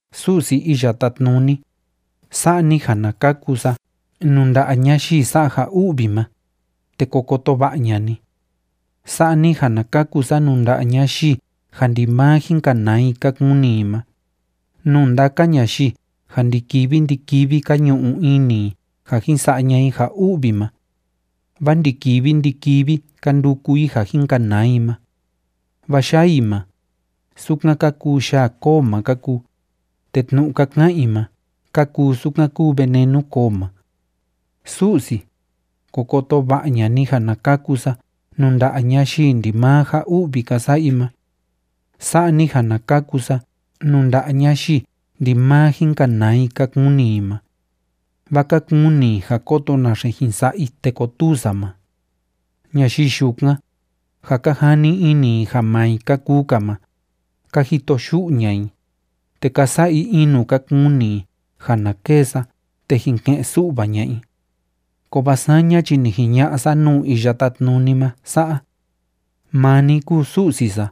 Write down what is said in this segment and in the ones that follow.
Su'si Iya Tátnuni, sa'a ni ja na kaku sa nuu nda'a ñayii sa'a ja u'vi ma, te ko koto va'a ña'a ni. Sa'a ni ja na kaku sa nuu nda'a ñayii ja ndimaa jin kanaa i ka kuni i ma, nuu ndaka ñayii ja ndi‑kivi ndi‑kivi ka ñu'u ini i ja jin sa'a ña'a i ja u'vi ma. Vaa ndi‑kivi ndi‑kivi ka nduku i ja jin kanaa i ma. Vaa yaa i ma, sukan ka kuu yaa koo ma ka kuu, te tnu'u ka ka'an i ma ka kuu sukan kúu venenu koo ma. Su'si, ko koto va'a ña'a ni ja na kaku sa nuu nda'a ñayii ndimaa ja u'vi ka sa'a i ma. Sa'a ni ja na kaku sa nuu nda'a ñayii ndimaa jin kanaa i ka kuni i ma. Vaa ka kuni i ja kóto naxe jin sa'a i te kotuu sa ma. Ñayii yukan, ja ka jani ini i ja maa i ka kuu‑ka ma, ka jito yu'u ña'a i, te ka sa'a i in nuu ka kuni i ja na kêe sa te jin ke'en su'va ña'a i. Kovaa saña chi ni jiña'a sa nuu Iya Tátnuni ma sa'a: “Maa ni kúu Su'si sa,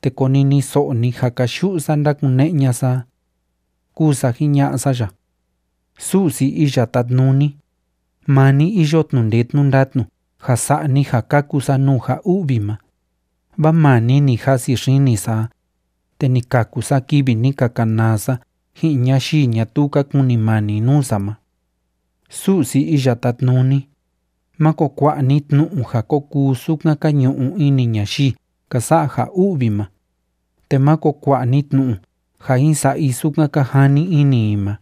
te koniniso'o ni ja káyu'u sa ndákune'e ña'a sa a”, kúu sa jiña'a sa ya. Su'si sa Iya Tátnuni, maa ni iyo tnu'u ndee tnu'u ndatnu ja sa'a ni ja kaku sa nuu ja u'vi ma, vaa maa ni ni jasi xini sa a, te ni kaku sa kivi ni ka kanaa sa ji'in ñayii ñatuu ka kunimani nuu sa ma. Su'si Iya Tátnuni, máko kua'a ni tnu'u ja ko kuu sukan ka ñu'u ini ñayii ka sa'a ja u'vi ma, te máko kua'a ni tnu'u ja jin sa'a i sukan ka jani ini i ma,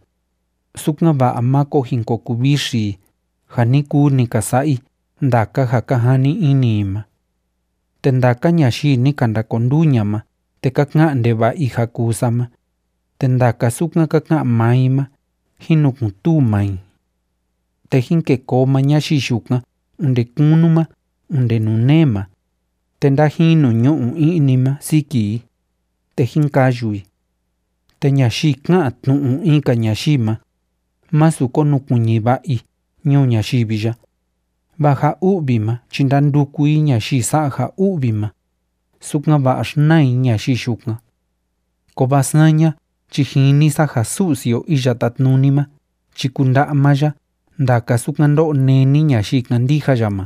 sukan‑va'a máko jin ko kuvixi i ja ni kuu ni ka sa'a i ndaka ja ka jani ini i ma. Te ndaka ñayii ni ka ndakonduu ña'a ma te ka ka'an ndeva'a i ja kuu sa ma, te ndaka sukan ka ka'an maa i ma jín nukun‑tuu maa i. Te jín kêe koo maa ñayii yukan onde kunu ma onde nuu nee ma, te ndájinu ñu'u i'ni ma siki i, te jín kayu i. Te ñayii ká'an tnu'u in‑ka ñayii ma, másu konukuiñi va'a i ñuu ñayivi ya, vaa ja u'vi ma chi ndanduku i ñayii sa'a ja u'vi ma, sukan‑va'a xnaa i ñayii yukan. Kovaa saña chi jini sa ja Su'si o Iya Tátnuni ma chi kunda'a maa ya ndaka sukan ndó'o néni ñayii kándija ya ma,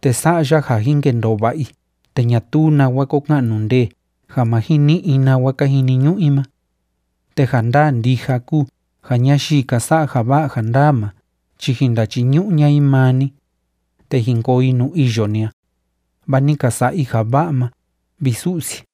te sa'a ya ja jin kendoo va'a i te ñatuu nawa ko ka'nu ndee ja ma jin ni'i i nawa ka jiniñu'u i ma. Te ja ndaa ndija kúu ja ñayii ka sa'a ja va'a ja ndaa ma chi jin ndachiñu'u ña'a i maa ni, te jin koo i nuu iyo ni a, vaa ni ka sa'a i ja va'a ma, vi Su'si.